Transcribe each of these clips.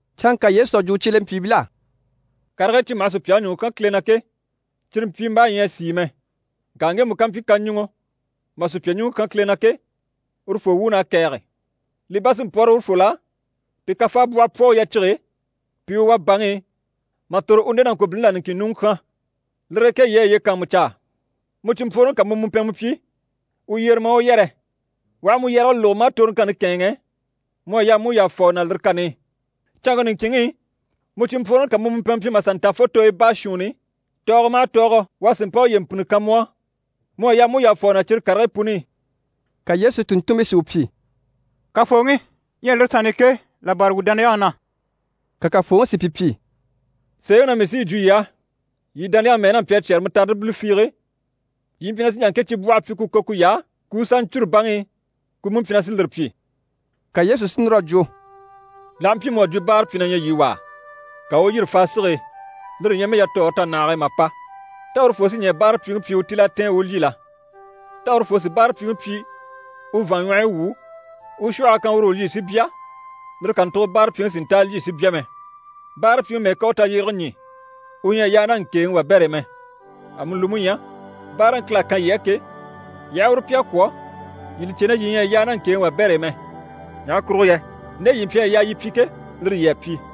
Canŋka Yesu à jwo u cyelempyiibil'á: «Karigii cyi maha sùpyaŋi ɲùŋɔ kyán Kile na ke, cyire mpyimbaa ɲyɛ a sìi mɛ. Ŋka ŋgemu ká mpyi kaɲuŋɔ maa sùpya ɲùŋɔ kyán Kile na ke, urufoo wuun'à kɛ̀ɛge! Li bá sí n‑pwɔ́rɔ urufol'á pi kafaabwɔhɔ pwɔ u yacige e, pi i u wà baŋi i, mà tòro u nde nàŋkobilini là niŋkin ɲùŋɔ kyán. Lire e ke yii a yiye kàanmucaa. Mu cìnmpworoŋi ká mu mùmpɛnmɛ pyi, u yyere maa u yɛrɛ. U aha mu yɛrɛge lógo, maa toroŋkanni kɛ̂ɛnŋɛ, mu à yaa mu u yàfa u na lire kani i. Canŋke niŋkinŋi i, mu cìnmpworoŋi ká mu mùmpɛnmɛ pyi mà sà nta fo tooyo baashuunni, tɔɔgɔ maha tɔɔgɔ u a sì mpa uye mpìnni kan mu á, mu à yaa mu u yàfa u na cyire karigii puni i.» Ka Yesu tùnntunmpii si u pyi: «Kafooŋi, ɲyɛ lire sanni i ke, là bâra wuu dániyaŋi na.» Ka Kafooŋi si pi pyi: «Sèeŋi na mii sí yi jwo yii á, yii dániyaŋi mɛ́ɛ n'a mpyi a cyɛ́rɛ mutaridi bile fiige, yii mpyi na sí n‑jà ŋke cibwɔhe pyi ku kò kuy'á, ku u sà ɲcûru baŋi i, ku mú mpyi na sí lire pyi.» Ka Yesu si núr'a jwo: «L'aha mpyi mu à jwo báarapyi na ɲyɛ yii wà á, ka u u yîri faa sige e, lire ɲyɛ mɛ yatɔɔre tanahage e mà pa, tá urufoo sí ɲɛɛ báarapyiŋi pyi u tíl'a tɛ̀ɛn u u lyî la? Tá urufoo sì báarapyiŋi pyi u vàanɲwɔhɔyi wwû, u u shwɔhɔ a kan uru u lyî si bya, lire kàntugo báarapyiŋi si nta a lyî si bya mɛ? Báarapyiŋi mɛ́ɛ ká u tayyerege ɲî, u ɲyɛ a yaa ná ŋkèeŋi wabɛr'e mɛ! Amuni li mú ɲyɛ, báaraŋi Kile à kan yii á ke, yii aha uru pyi a kwɔ̀, yii li cè na yii ɲyɛ a yaa ná ŋkèeŋi wabɛr'e mɛ. Ɲaha kurugo yɛ nde yii mpyi a yaa yii pyi ke, lire yii à pyi.»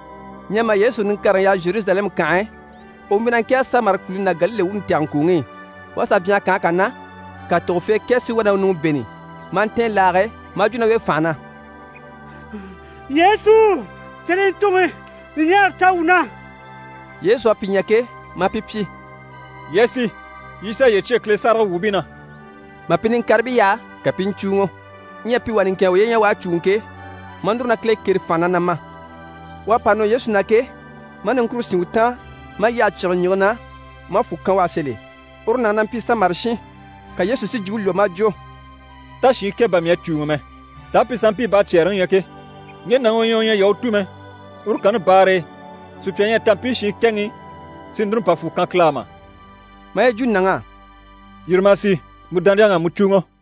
Ɲyɛ mà Yesu niŋkareŋi yaha Zheruzalɛmu kànhe e, u mpyi na ŋkɛ̀ɛge Samari kùluni ná Galile wuuni tɛgɛŋkuuŋi i. U à sà byanhara kànhe kà na, ka tògofee kɛ si wá na u ɲùŋɔ bêni, maa ntɛ̀ɛn laage e, maa jwo ná u e fànha na: «Yesu! Cyelentuŋi! Ɲùɲaara ta wuu na!» Yesu à pi ɲya ke, maa pi pyi: «Yii a sì, yii sà yiye cyêe Kile sáragawwuubii na.» Mà pi niŋkaribii yaha, ka pi i ɲcùuŋɔ. Ɲyɛ pi wà niŋkin a uye ɲya u à cùuŋɔ ke, maa núru na Kile kêre fànha na, na ma. U à pa nɔ Yesu na ke, maa niŋkure sín u taan maa yyahe cyígile ɲìŋke na maa fwù kan u á sèl'e. Uru nàŋi na mpyi Samari shin. Ka Yesu si jwumpe lwɔ́ maa jwo: «Tá shiin kɛ bà mii à cùuŋɔ mɛ? Taa pi sanmpii baacyɛɛreŋi ɲyɛ ke? Ŋge nàŋi u ɲyɛ u ɲyɛ Yahutu mɛ, uru kanni baare e, sùpya ɲyɛ a ta mpii shiin kɛŋi i, si núru n‑pa fwù kan Kile á mà?» Maa yi jwo nàŋ'á: «Yîri ma a sì, mu dániyaŋ'à mu cùuŋɔ.»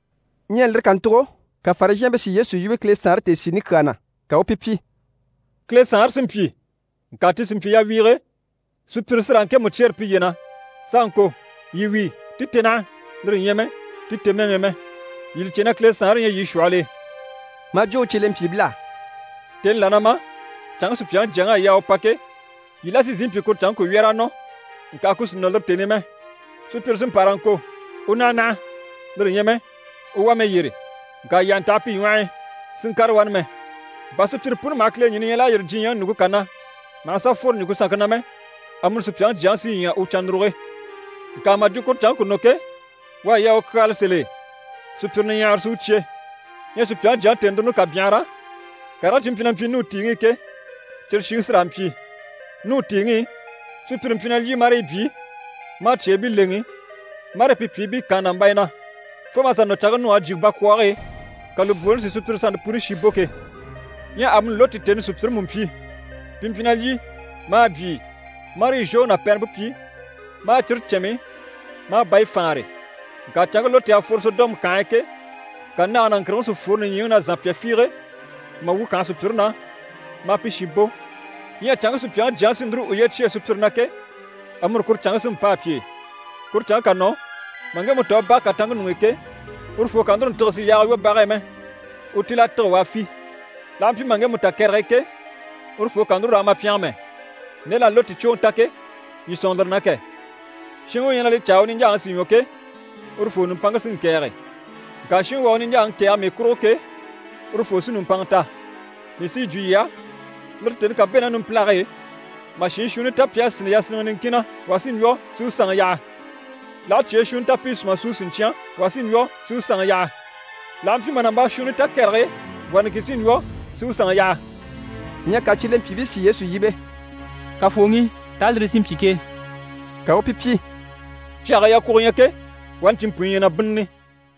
Ɲyɛ lire kàntugo, ka Farizhɛɛnbii si Yesu yíbe Kile Saanre tèesiini kyaa na, ka u u pi pyi: «Kile Saanre sí n-pyi, ŋka ti sì n‑pyi yawiige, sùpyire sí raa ŋkemu cyêre piye na s'a ŋko “Yii wíi, ti te naha!” lire ɲyɛ mɛ “Ti te mɛŋi i!” mɛ. Yii li cè na Kile Saanre ɲyɛ yii shwɔhɔl'e.» Maa jwo u cyelempyiibil'á: «Tèni là na ma, canŋke Supyaŋi Jyaŋi à yaa u pa ke, yii la sí n-sìi n-pyi kuru canŋke ku wyɛ̀r'a nɔ, ŋka ku sì nɔ lire tèni i mɛ. Sùpyire sí n‑pa raa ŋko “U naha naha!” lire ɲyɛ mɛ “U wá mɛ yyére!” Ŋka yii àha ntaha pi ɲwɔh'i, si ŋkàre wani mɛ. Bà sùpyire puni maha kileɲini ɲya l'à yîri diɲyɛŋi ɲùŋke kà na, maha sà fworo ɲùŋke sanŋke na mɛ, amuni Supyaŋi Jyaŋi sí ɲya u cannuruge. Ŋka mà jwo kuru canŋke ku nɔ ke, u à yaa u kyaala sèl'e, sùpyire niɲyahara sí u cyé. Ɲyɛ Supyaŋi Jyaŋi tèenuruni ká byanhara, karigii cyi mpyi na mpyi Nuhu tìiŋi i ke, cyire shiŋi sí raa n‑pyi. Nuhu tìiŋi i, sùpyire mpyi na lyî, marii byii, maa cyeebii lèŋi, marii pi pyìibii kaan nàmbaya na, fo mà sà nɔ canŋke Nuhu a jyè bakwɔɔge e, ka lùbwooni si sùpyire sannte puni shi bò ke. Ɲyɛ amuni Loti tèni i sùpyire mú mpyi. Pi mpyi na lyî, maa byii, marii zhwoŋi ná pɛrɛmpe pyi, maa cire cɛnmi, maa bayi faanre. Ŋka canŋke Loti à fworo Sɔdɔmu kànhe e ke, ka nage ná ŋkìrigiŋi si fworo nìɲyiŋi na zànpya fiige, mà wu kànhe sùpyire na, maa pi shi bò, ɲyɛ canŋke Supyaŋi Jyaŋi sí núru uye cyêe sùpyire na ke, amuni kuru canŋke sí n‑pâa pi e. Kuru canŋke ká nɔ, mà ŋgemu ta u bage kàtanŋke ɲuŋ'i ke, urufoo kà núru ntîge si yaaga lwɔ́ bage e mɛ, u tíl'a tîge u a fî. L'aha mpyi mà ŋgemu ta kɛrɛge e ke, urufoo kà núru raa ma pyɛngɛ mɛ. Nde l'à Loti cwoŋi ta ke, yii sɔ̂nŋɔ lire na kɛ! Shinŋi u ɲyɛ na li caa u niɲjaaŋi si ɲwɔ ke, urufoo nùmpanŋke sí n‑kɛ̀ɛge. Ŋka shinŋi u à u niɲjaaŋi kɛ̀ɛge mii kurugo ke, urufoo sí nùmpanŋa ta. Mii sí yi jwo yii á, lire tèni ká bɛ̂ ná numpilage e, mà shiin shuunni ta pi à sínni yasinniŋɛ niŋkin na, wà sí n‑lwɔ́ si u sanŋi yaha. L'aha cyee shuunni ta pi i sùma súu siɲcyan, wà sí n‑lwɔ́ si u sanŋi yaha. [ L'aha mpyi mà nàmbaa shuunni ta kɛrɛge e, wà niŋkin sí n‑lwɔ́ si u sanŋi yaha.]» Ɲyɛ ka cyelempyiibii si Yesu yíbe: «Kafooŋi, taa lire sí n‑pyi ke?» Ka u u pi pyi: «Cyage e yakwugo ɲyɛ ke, wani cinmpunɲyi ɲyɛ na bínnini.»